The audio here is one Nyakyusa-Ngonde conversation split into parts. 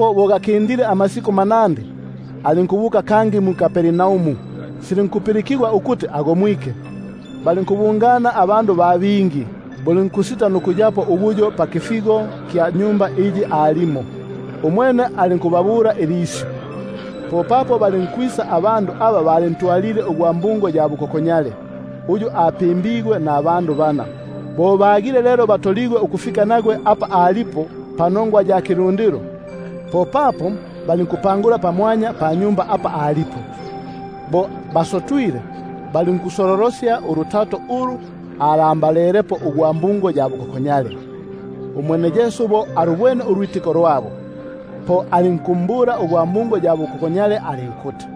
Bo gakindile amasiku manandi, alinkwingila kangi mu-Kapernaumu; silinkupilikigwa ukuti ali nnyumba. Balinkubungana abandu ba bingi, bulinkusita nukuyapo ubuyo pakifigo, umwene alinkubabula ilisyu. Popapo balinkwisa abandu aba balintwalile ugwa bukokonyale, uyu apimbigwe nabandu bana. Bagile lelo batoligwe ukufika apa alipo panongwa ya kilundilo; popapo balinkupangula pamwanya panyumba apa alipo. Bo basotwile, balinkusololosya ulutato ulu alambalelepo ugwa bukokonyale. Umwene Yesu bo alubwene ulwitiko lwabo, po alinkumbula ugwa bukokonyale alinkuti: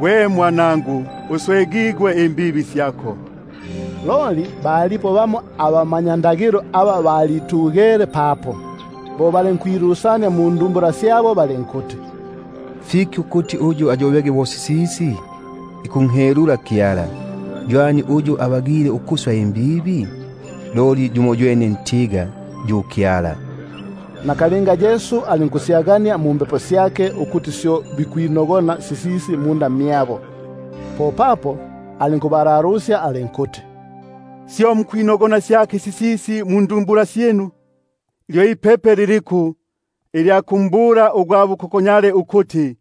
Gwe mwanangu ugwe, uswegigwe inongwa syako. Loli balipo bamo abamanyakalata aba balitugele papo, balinkwilusania mundumbula syabo balinkuti: Fiki ukuti uyu ayobege bo sisisi? Ikunhelula Kyala! Ywani uyu abagile ukuswa inongwa? Loli yumoywene itolo, yo yu Kyala. Nakalinga Yesu alinkusyagania mumbepo syake, ukuti syo bikwilusania munda mmyabo, alinkubabula alinkuti: Syo mukwilusania syaki sisisi mundumbula syinu? Lyo ipepe liliku, ilya kumbula ugwa bukokonyale ukuti: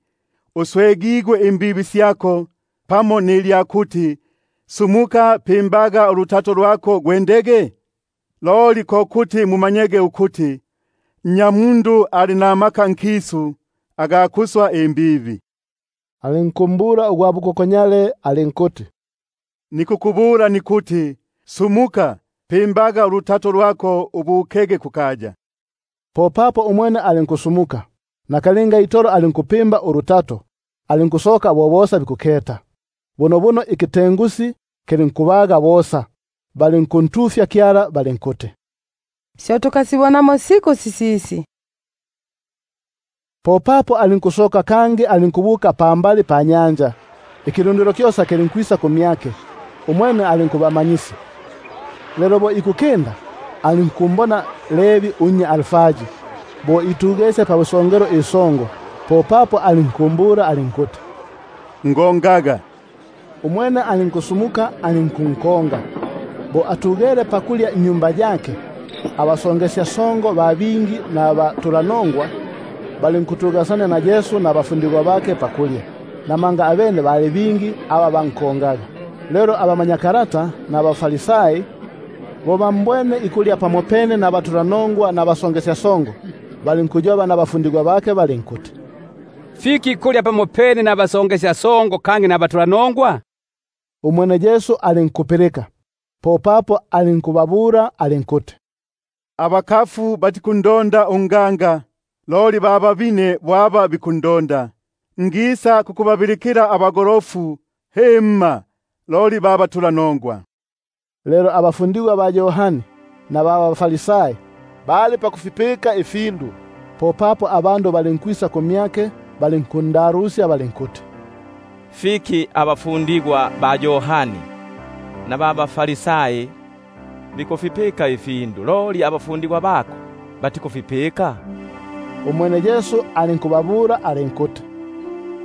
Uswegigwe imbibi syako, pamo nilya kuti: Sumuka pimbaga ulutato lwako gwendege? Loli ko kuti mumanyege ukuti, Nnya- mundu ali namaka ukuswa inongwa nkisu — alinkumbula ugwa bukokonyale alinkuti: Nikukubula nikuti: Sumuka, pimbaga ulutato lwako ubukege kukaya. Popapo umwene alinkusumuka, nakalinga itolo alinkupimba ulutato alinkusoka bo bosa bikuketa; bunobuno ikitengusi kilinkubaga bosa, balinkuntufya Kyala balinkuti: Syo tukasibonamo siku sisisi. Popapo alinkusoka kangi, alinkubuka pambali panyanja. Ikilundilo kyosa kilinkwisa kumyake, umwene alinkuba- manyisya. Lelo bo ikukinda, alinkumbona Levi unnya Alfai bo itugesye pabusongelo isongo, popapo alinkumbula alinkuti: Ngongaga. Umwene alinkusumuka alinkunkonga. Bo atugele pakulya nnyumba yake, abasongesyasongo ba bingi nabatulanongwa balinkutugasania na Yesu nabafundigwa bake pakulya, namanga abene bali bingi aba bankongaga. Lelo abamanyakalata ba baFarisai bo bambwene ikulya pamopene nabatulanongwa nabasongesyasongo, balinkuyoba nabafundigwa bake balinkuti: Fiki ikulya pamopene nabasonge- syasongo nabatulanongwa? Bo Yesu apilike, alinkubabula alinkuti: Bakaya bo bakafu aba bikundonda unganga, loli ba babine. Ngisa kukubabilikila abagolofu, himma, loli ba batulanongwa. Lelo abafundigwa ba Yohani nabaFarisai bali pakufipika ifiundu. Popapo balinkwisa abandu balinkumbula balinkuti: Fiki abafundigwa ba Yohani naba baFarisai bikufipika ifindu, loli abafundigwa bako batikufipika? Umwene Yesu alinkubabula alinkuti: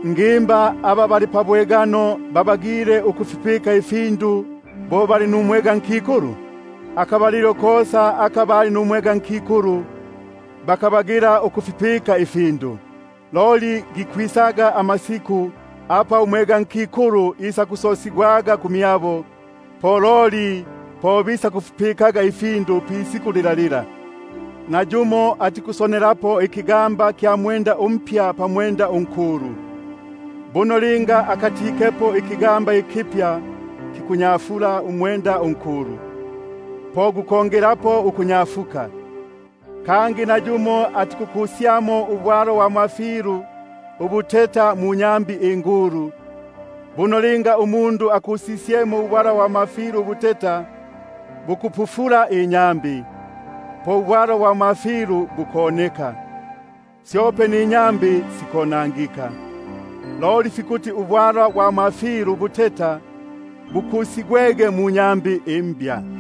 Ngimba aba pabwegano babagile ukufipika ifindu bo bali numwegankikulu? Akabalilo kosa aka bali numwegankikulu, bakabagila ukufipika ifindu. Loli gikwisaga amasiku apa umwegankikulu isakusosigwangako ku- myabo, po loli po bisakufipikaga ifindu ilisiku lilyo. Nayumo atikusonelapo ikigamba kya mwenda umpya pamwenda unkulu; buno linga akatikepo, ikigamba ikipya kikunyafulako umwenda unkulu, po gukongelapo ukunyafuka. Kangi nayumo atikukusyamo ubwalwa bwa mafilu ubuteta munyambi ingulu; buno linga umundu akusisyemo ubwalwa ubuteta bukupufula inyambi, po ubwalwa bwa mafilu bukoneka, syope ninyambi sikonangika. Loli fikuti ubwalwa bwa mafilu ubuteta bukusigwege munyambi imbya.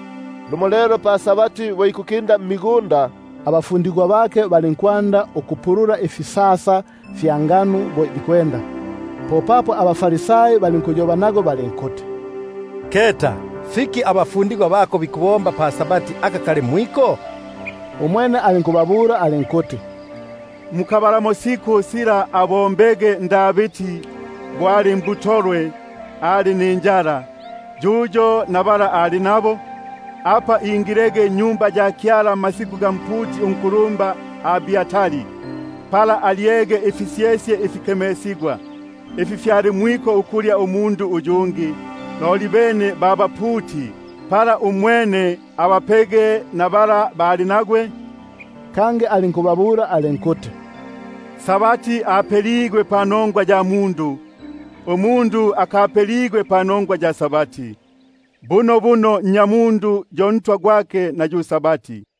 Lumo pa-Sabati bo ikukinda mmigunda, abafundigwa bake balinkwanda ukupulula ifisasa fya ngano bo bikwenda. Popapo abaFarisai balinkuyoba nagwe balinkuti: Keta! Fiki bikubomba pa-Sabati aka kali mwiko? Umwene alinkubabula alinkuti: Mukabalamo sila abombege Davidi, bo ali mbutolwe ali ninjala, yuyo naba bali nagwe? Apa ingilege nnyumba ya Kyala mmasiku ga mputi unkulumba Abiatari, pala alyege ifisyesye ifikemesigwa, ifi fyali mwiko ukulya yumo umundu, loli bene ba baputi, apa abapege naba bali nagwe? Kangi alinkubabula alinkuti: Sabati apeligwe panongwa ya mundu, umundu akapeligwe panongwa ya Sabati. Bunobuno Nnyamundu yo Malafyale gwake na yu Sabati.